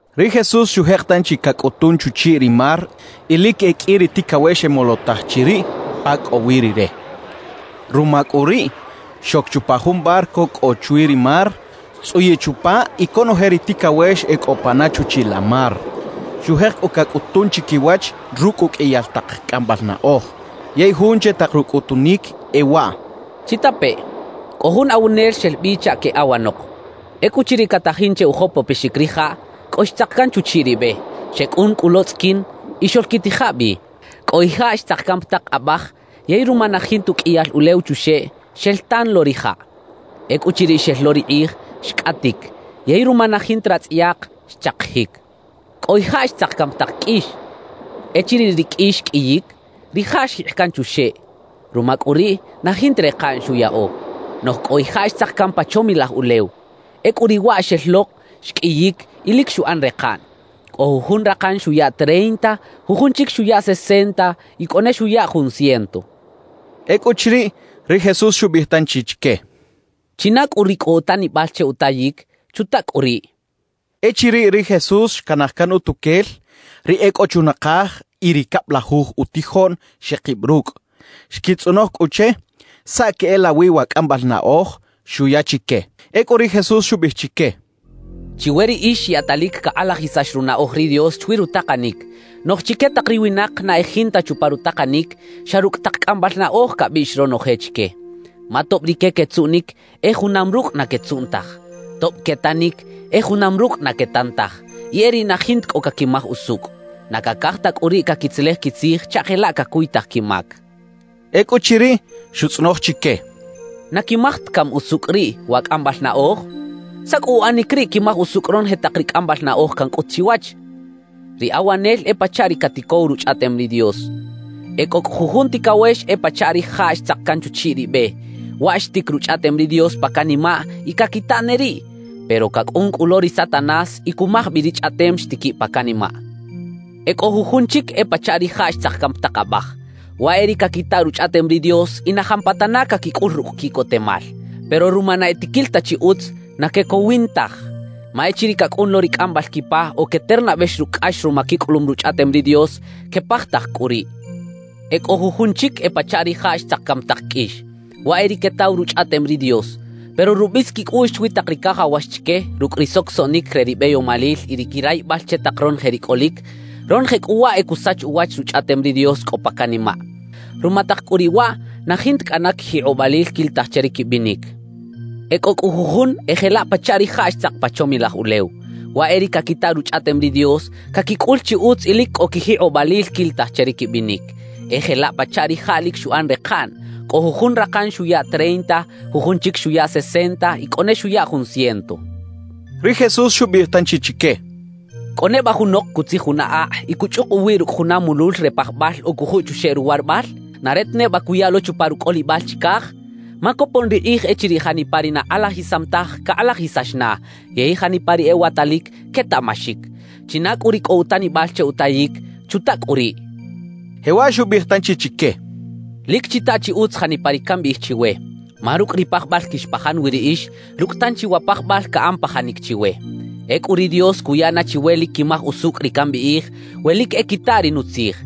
Ri Jesús xujek tanchi cacꞌutun chuchiꞌ ri mar y lic e qꞌui ri ticawex xemolotaj chiriꞌ pa cꞌo wi Rire. Ruma cꞌu riꞌ xoc chupa jun barco cꞌo chwi ri mar, xtzꞌuyiꞌ chupa y conoje ri ticawex e cꞌo pana chuchiꞌ la mar. Xujek cꞌu cacꞌutun chiquiwach rucꞌ uqꞌuiyal tak cꞌambal naꞌoj, yey jun che tak rucꞌutunic e waꞌ: «¡Chitapeꞌ! Cꞌo jun awanel xel bi chaꞌ queꞌawanok. Ecꞌuchiriꞌ catajin che ujopopexic rijaꞌ, cꞌo xtzak can chuchiꞌ ri be. Xecꞌun cꞌu lo tzꞌiquin, y xoꞌlquitija bi. »Cꞌo ijaꞌ xtzak can pa tak abaj; yey ruma na jinta uqꞌuiyal ulew chuxeꞌ, xel tan lo rijaꞌ. Ecꞌuchiriꞌ xel lo ri kꞌij, xcꞌatic; yey ruma na jinta ratzꞌayak, xchakijic. »Cꞌo ijaꞌ xtzak can pa tak qꞌuix. Echiriꞌ ri qꞌuix xqꞌuiyic, rijaꞌ xjikꞌ can chuxeꞌ; ruma cꞌu riꞌ, na jinta rekaꞌn xuyaꞌo. »Noꞌj cꞌo ijaꞌ xtzak can pa chomilaj ulew. Ecꞌu riꞌ waꞌ xel lok, xqꞌuiyic y lic xuꞌan rekaꞌn. Cꞌo jujun rakan xuya treinta, jujun chic xuya sesenta y cꞌo ne xuya jun ciento» xchaꞌ. Ecꞌuchiriꞌ, ri Jesús xubiꞌij tanchi chique: «China cꞌu ri cꞌo utanibal che utayic, ¡chuta cꞌu riꞌ!» xchaꞌ. Echiriꞌ ri Jesús xcanaj can utuquel, ri e cꞌo chunakaj y ri cablajuj utijoꞌn xekib rucꞌ, xquitzꞌonoj cꞌu che saꞌ queꞌelawi wa cꞌambal naꞌoj xuya chique. Ecꞌu ri Jesús xubiꞌij chique: «Chiwe riꞌix yaꞌtalic cakꞌalajisax runaꞌoj ri Dios chwi rutakanic. Noꞌj chique tak ri winak na e jinta chupa rutakanic, xa rucꞌ tak cꞌambal naꞌoj cabiꞌx ronoje chique. Ma tob rique quetzuꞌnic, e junam rucꞌ na quetzuꞌn taj; tob quetanic, e junam rucꞌ na quetan taj y e riꞌ na jinta cꞌo caquimaj usucꞌ. Na cacaj ta cꞌu riꞌ caquitzelej quitzij chaꞌ jelaꞌ cacuytaj quimac» xchaꞌ. Ecꞌuchiriꞌ, xutzꞌonoj chique: «¿Na quimaj ta cami usucꞌ riꞌ wa cꞌambal naꞌoj? ¿Saꞌ cꞌu uꞌanic riꞌ quimaj usucꞌ ronoje tak ri cꞌambal naꞌoj cancꞌut chiwach? »Ri awanel e pachaꞌ ri caticow Ruchꞌaꞌtem ri Dios. »E cꞌo cꞌu jujun ticawex e pachaꞌ rijaꞌ xtzak can chuchiꞌ ri be; waꞌ xtic Ruchꞌaꞌtem ri Dios pa canimaꞌ y caquita ne riꞌ. Pero cacꞌun cꞌu lo ri Satanás y cumaj bi ri Chꞌaꞌtem xtiquiꞌ pa canimaꞌ. »E cꞌo jujun chic e pachaꞌ rijaꞌ xtzak can pa tak abaj. Waꞌ e ri caquita Ruchꞌaꞌtem ri Dios y na jampatana caquicꞌul rucꞌ quiꞌcotemal. Pero ruma na e tiquil ta chi utz, na quecowin taj. Ma echiriꞌ cacꞌun lo ri cꞌambal quipa o queternabex rucꞌ cꞌax ruma quicꞌulum Ruchꞌaꞌtem ri Dios, quepajtaj cꞌu riꞌ. »E cꞌo jujun chic e pachaꞌ rijaꞌ xtzak can pa tak qꞌuix. Waꞌ e ri quetaw Ruchꞌaꞌtem ri Dios. Pero rubis quicꞌuꞌx chwi tak ri cajawax chique, rucꞌ ri socosoꞌnic re ri beyomalil y ri quirayibal che tak ronoje ri cꞌolic; ronoje cꞌu waꞌ e cusach uwach Ruchꞌaꞌtem ri Dios cꞌo pa canimaꞌ. Ruma tak cꞌu riꞌ waꞌ na jinta cꞌana quijikꞌobalil quilitaj che ri quibinic. »E cꞌo cꞌu jujun e jelaꞌ pachaꞌ rijaꞌ xtzak pa chomilaj ulew. Waꞌ e ri caquita Ruchꞌaꞌtem ri Dios, caquicꞌul chi utz y lic cꞌo quijikꞌobalil quilitaj che ri quibinic. E jelaꞌ pachaꞌ rijaꞌ lic xuꞌan rekaꞌn; cꞌo jujun rakan xuya treinta, jujun chic xuya sesenta y cꞌo ne xuya jun ciento» xchaꞌ. Ri Jesús xubiꞌij tanchi chique: «¿Cꞌo neba junok cutzij juna akꞌ y cuchꞌuk uwiꞌ rucꞌ juna mulul re pajbal o cujuꞌ chuxeꞌ ruwarabal? ¿Na re ta neba cuya lo chupa rucꞌolibal chicaj? Ma copon ri kꞌij echiriꞌ janipa ri na kꞌalajisam taj, cakꞌalajisax na; yey janipa ri ewatalic, quetaꞌmaxic. China cꞌu ri cꞌo utanibal che utayic, ¡chuta cꞌu riꞌ!» xchaꞌ. Jewaꞌ xubiꞌij tanchi chique: «Lic chita chi utz janipa ri cambiꞌij chiwe, ma “rucꞌ ri pajbal quixpajan wi riꞌix, rucꞌ tanchi wa pajbal caꞌan pajanic chiwe.” Ecꞌu ri Dios cuya na chiwe lic quimaj usucꞌ ri cambiꞌij, we lic e quita ri nutzij.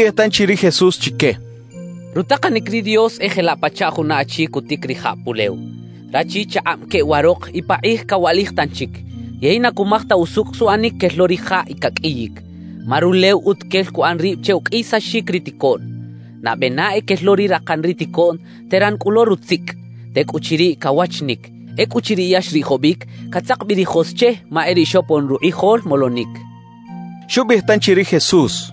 Xubiꞌij tanchi ri Jesús chique: «Rutakanic ri Dios e jelaꞌ pachaꞌ juna achi cutic rijaꞌ pulew. Rachi chakꞌab queꞌwarok y pakꞌij cawaꞌlij tanchic; yey na cumaj ta usucꞌ suꞌanic quel lo rijaꞌ y caqꞌuiyic. Ma rulew utuquel cuꞌan rib che uqꞌuiyisaxic ri ticoꞌn. Nabe na e quel lo ri rakan ri ticoꞌn, teran cꞌu lo rutzicꞌ; tecꞌuchiriꞌ, cawachinic. Ecꞌuchiriꞌ ya xriꞌjobic, catzak bi ri jos che ma e riꞌ xopon rukꞌijol molonic» xchaꞌ. Xubiꞌij tanchi ri Jesús: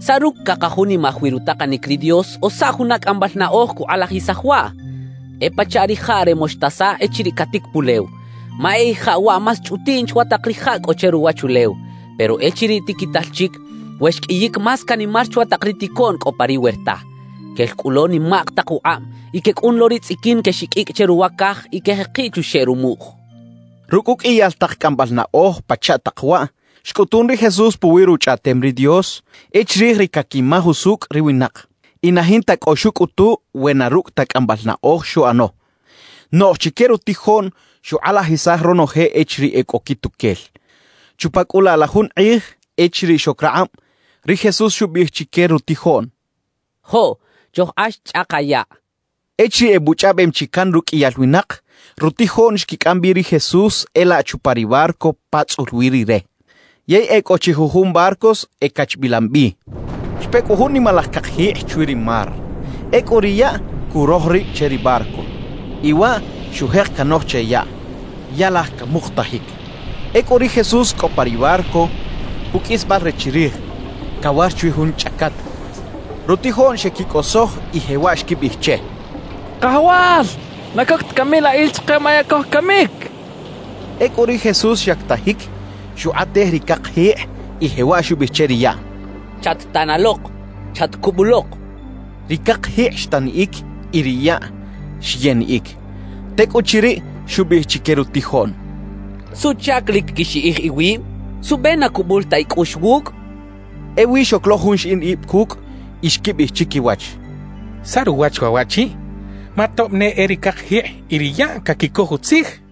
«¿Saꞌ rucꞌ cakajunimaj wi rutakanic ri Dios, o saꞌ juna cꞌambal naꞌoj cukꞌalajisaj waꞌ? E pachaꞌ rijaꞌ re moxtasa echiriꞌ catic pulew. Ma e ijaꞌ waꞌ más chꞌutiꞌn chwa tak rijaꞌ cꞌo che ruwachulew, pero echiriꞌ tiquital chic, we xqꞌuiyic más canimar chwa tak ri ticoꞌn cꞌo pa ri werta. Quel cꞌu lo nimak tak ukꞌab y quecꞌun lo ri tzꞌiquin quexiqꞌuicꞌ che ruwa caj y quejekiꞌ chuxeꞌ rumuꞌj» xchaꞌ. Rucꞌ uqꞌuiyal tak cꞌambal naꞌoj pachaꞌ tak waꞌ, xcꞌutun ri Jesús puwi Ruchꞌaꞌtem ri Dios, e chirij ri caquimaj usucꞌ ri winak. Y na jinta cꞌo xucꞌutu we na rucꞌ ta cꞌambal naꞌoj xuꞌano; noꞌj chique rutijoꞌn xukꞌalajisaj ronoje echiriꞌ e cꞌo quituquel. Chupa cꞌu laꞌ la jun kꞌij echiriꞌ xoc rakꞌab, ri Jesús xubiꞌij chique rutijoꞌn: —Joꞌ, chojkꞌax chꞌaka yaꞌ —xcha chique. Echiriꞌ ebuchꞌaꞌbem chi can ruqꞌuiyal winak, rutijoꞌn xquicꞌam bi ri Jesús e laꞌ chupa ri barco pa tzꞌul wi Rire, yey e cꞌo chi jujun barcos ecachbilam bi. Xpe cꞌu jun nimalaj cakjikꞌ chwi ri mar. Ecꞌu ri yaꞌ curoj rib che ri barco; y waꞌ xujek canoj che yaꞌ, ya laj camukutajic. Ecꞌu ri Jesús cꞌo pa ri barco puqꞌuisbal re chirij, cawar chwi jun chꞌacat. Rutijoꞌn xeꞌquicꞌosoj y jewaꞌ xquibiꞌij che: —¡Kajawal! ¿Na coc ta cami la il chike? ¡Ma ya cojcamic! —xechaꞌ. Ecꞌu ri Jesús xyactajic, xukꞌatej ri cakjikꞌ y jewaꞌ xubiꞌij che ri yaꞌ: —¡Chat-tanalok! ¡Chatcubulok! —xcha che. Ri cakjikꞌ xtaniꞌic y ri yaꞌ xyeniꞌic. Tecꞌuchiriꞌ, xubiꞌij chique rutijoꞌn: —¿Suꞌchac lic quixiꞌij iwib? ¿Suꞌbe na cubul ta icꞌuꞌx wucꞌ? —xcha chique. Ewi xoc lo jun xiꞌin ib cucꞌ y xquibiꞌij chiquiwach: —¿Saꞌ ruwach waꞌ waꞌchi? ¡Ma tob ne e ri cakjikꞌ y ri yaꞌ caquicoj utzij! —xechaꞌ.